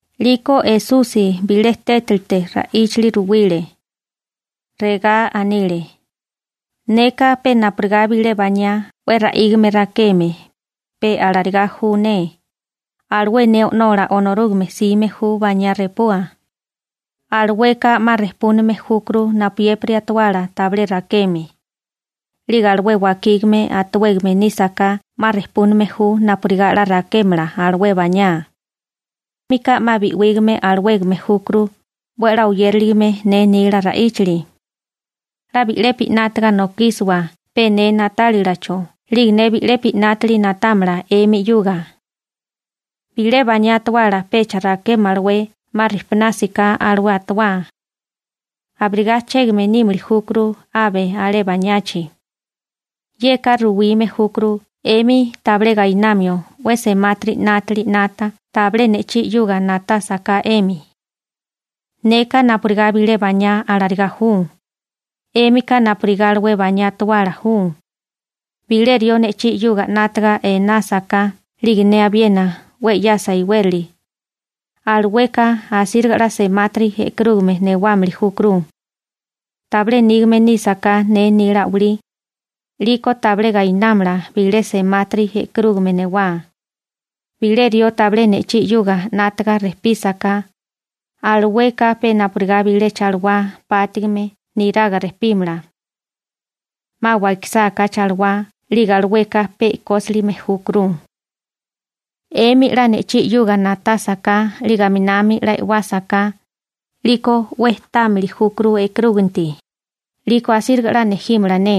'Liko Esusi bilé tétilite ra'íchali ruwile. Regá anile: ―Neka pe napurigá bilé baniá 'we ra'ígame rakeme, pe alarigá ju ne. Alué ne O'nola Onorúgame 'sime ju baniá repua. Alueka 'ma rejpúname júkuru napuyépiri atuala tabilé rakeme. 'Lige alué wakígame a'tuwégame nísaká 'ma rejpúname ju napurigá 'la rakémala alué baniá. 'Émika 'ma bi'wígame alawégame júkuru 'we a'lá oyériligame ne nila ra'ichálila. 'La bi'lepi 'nátaga nokísiwa pe ne na'tálilacho 'lige ne bi'lepi 'nátili na'támala 'emi 'yuga. Bilé baniá atuala pecha rakémalawé 'ma rijpunásiká alué a'tuwá. Abirigá chégame nímili júkuru abe alé baniachi. Yeka ruwime júkuru 'emi tabilé gainamio 'we semátiri 'nátili 'nata tabilé ne'chí 'yuga na'tásaká 'emi. › Neka napurigá bilé baniá alarigá ju, 'émika napurigá alué baniá atuala ju. Bilé rió ne'chí 'yuga 'nátaga inásaká 'lige ne abiena 'we 'yasa iwérali, alueka asíriga 'la semáriga bejtélamala. Tabilé nígame nísaká ne nila a'walí, 'liko tabilé 'la semáriga bejtélamala. Bilé rió tabilé ne'chí 'yuga 'nátaga rejpísaká, alueka pe napurigá bilé chalawá pátigime niraga rejpímala. 'Ma wakisáká chalawá 'lige alueka pe e'kósilime júkuru. › 'Emi 'la ne'chí 'yuga na'tásaká 'lige aminami 'la e'wásaká, 'liko 'we támili júkuru e'karúginti, 'liko asíriga 'la nejímala ne.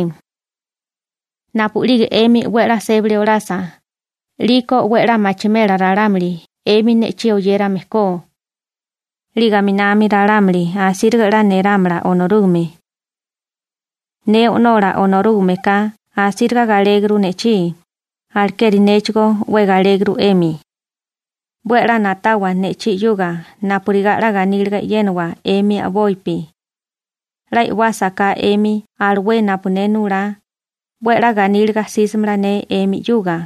Napu'lige 'emi 'we a'lá sébali olasa, 'liko 'we a'lá machimela ralámuli 'emi ne'chí oyérame ko. 'Lige aminami ralámuli asíriga 'la nerámala Onorúgame. Ne O'nola Onorúgameka asíriga galéguru ne'chí, alekeri néchigó 'we galéguru 'emi. 'We a'lá na'tawa ne'chí 'yuga napurigá 'la ganíliga e'yénawa 'emi a'bopi. 'La e'wásaká 'emi alué napu ne nulá, 'we a'lá ganíliga asimela ne 'emi 'yuga.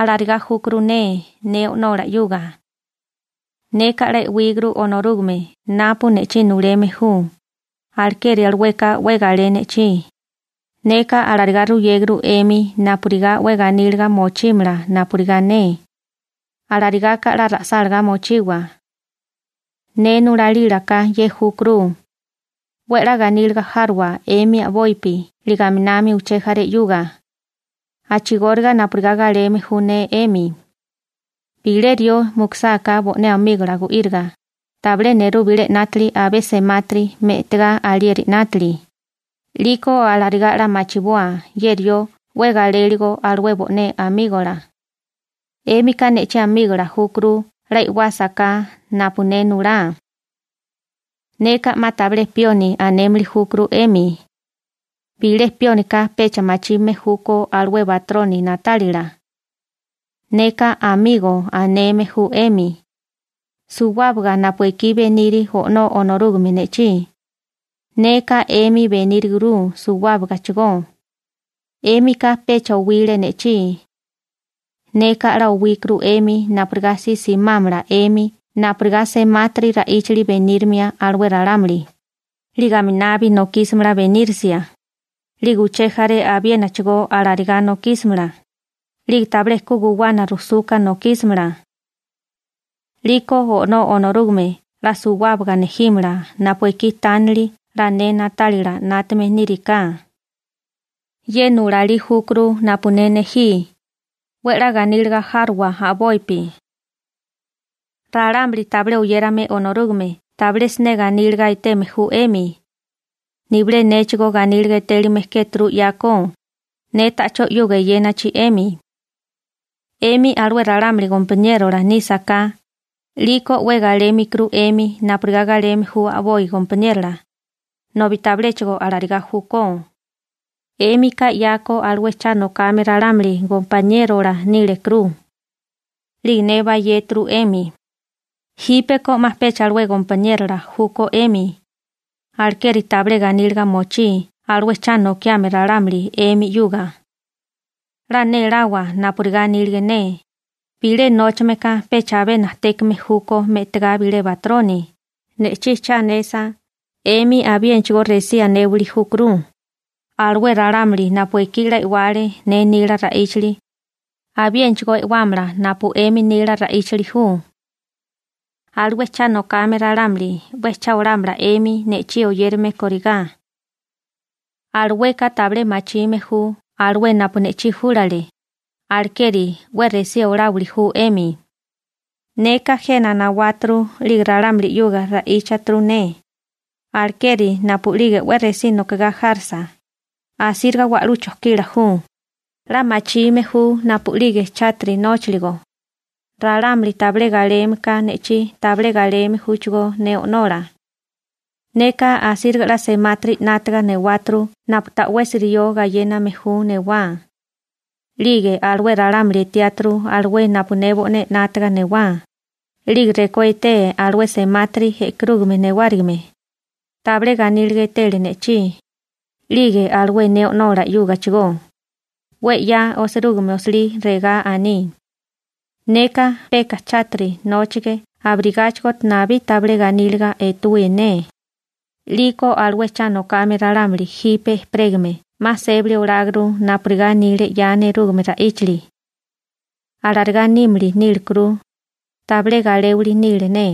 Alarigá júkuru ne ne O'nola 'yuga. Neka 'la e'wíguru Onorúgame napu ne'chí nuleme ju, alekeri alueka 'we galé ne'chí. › Neka alarigá ruyéguru 'emi napurigá 'we ganíliga mochímala napurigá ne. Alarigaka 'la ra'sálagá mochiwa. Ne nulalílaka ye júkuru: 'We a'lá ganíliga járowa 'emi a'bopi 'lige aminami uché jaré 'yuga, a'chigóriga napurigá galeme ju ne 'emi. Bilé rió mukusáká bo'né amígola gu'íriga, tabilé nerú bilé 'nátili abé semátiri me'tigá alieri 'nátili. 'Liko alarigá 'la machiboa ye rió 'we galéligo alué bo'né amígola. 'Émika ne'chí amígola júkuru 'la e'wásaká napu ne nulá. Neka 'ma tabilé «pioni» anémili júkuru 'emi. Bilé piónika pecha machime júkó alué batroni na'tálila. Neka «amigo» aneme ju 'emi. Suwábaga napu ekí beniri O'nó Onorúgame ne'chí, neka 'emi beníruguru suwábagachigó. 'Émika pecha owile ne'chí. Neka 'la owíkuru 'emi napurigá si simámala 'emi napurigá semátiri ra'íchali benírimia alué ralámuli, 'lige aminabi nokísimala benírisia, 'lige uché jaré abiénachigó alarigá nokísimala, 'lige tabilé ku guwana rujsuka nokísimala. 'Liko O'nó Onorúgame 'la suwábaga nejímala napu ekí tánili 'la ne na'tálila 'nátame niri ka. Ye nulalí júkuru napu ne nejí: 'We 'la ganíliga járowa a'bopi. › Ralámuli tabilé oyérame Onorúgame tabilé siné ganíliga eteme ju 'emi. Nibilé néchigó ganíliga etélime kéturu 'yako, ne ta'chó 'yuga eyénachi 'emi. 'Emi alué ralámuli gompaniérola nísaká, 'liko 'we galémilikuru 'emi napurigá galeme ju a'boi gompaniérola, nobi tabiléchigo alarigá júkó. 'Émika 'yako alué cha nokame ralámuli gompaniérola nílekuru, 'lige ne bayéturu 'emi. Jípeko 'ma pecha alué gompaniérola júkó 'emi. Alekeri tabilé ganíliga mochí alué cha nokame ralámuli 'emi 'yuga. 'La néláwa napurigá anílige ne: «Bilé nóchame ka pecha abé najtékame júkó me'tigá bilé batroni.» Ne'chí cha anesa, 'emi abiénachigó resí anéwali júkuru. Alué ralámuli napu ekí 'la e'wale ne nila rejcholi, abiénachigó e'wámala alué rejcholi napu 'emi nila ju. Alué cha nokame ralámuli 'we cha olámala 'emi ne'chí oyérame kórigá. Alueka tabilé machime ju alué napu ne'chí júlale, alekeri 'we resí oláwili ju 'emi. › Neka jena nawáturu 'lige ralámuli 'yuga ra'íchaturu ne. Alekeri napu'lige 'we resí nokigá járisa, asíriga wa'lú chojkila ju. 'La machime ju napu'lige chátiri nóchiligo. Ralámuli tabilé galeme ka ne'chí tabilé galeme júchigó ne O'nola. Neka asíriga 'la semátiri 'nátaga newáturu napu ta'wesi rió gayéname ju newá. 'Lige alué ralámuli etiáturu alué napu ne bo'né 'nátaga newá, 'lige rekó etee alué semati e'karúgame newárigime, tabilé ganíliga etele ne'chí, 'lige alué ne O'nola 'yúgachigó. 'We 'ya osirúgime osilí regá aní: «Neka peka chátiri nóchige abirigáchigo nabí tabilé ganíliga etuí ne.» 'Liko alué cha nokame ralámuli jipe ejperégame 'ma sébali oláguru napurigá anile 'ya nerúgame ra'íchali. Alarigá nímili nílekuru, tabilé galéwili nile ne. ›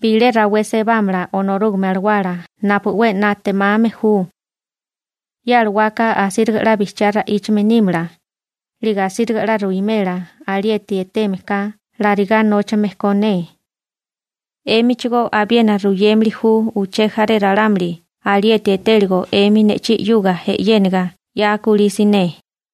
Bilé rawé sebámala Onorúgame Alawala napu 'we na'temame ju. Ye alawaka asíriga 'la bijchiga ra'íchame nímala, 'lige asíriga 'la ruwimela alieti eteme ka larigá nóchame ko ne. 'Émichigó abiena ruyémili ju uché jaré ralámuli alieti etéligo 'emi ne'chí 'yuga e'yéniga 'ya kulí siné.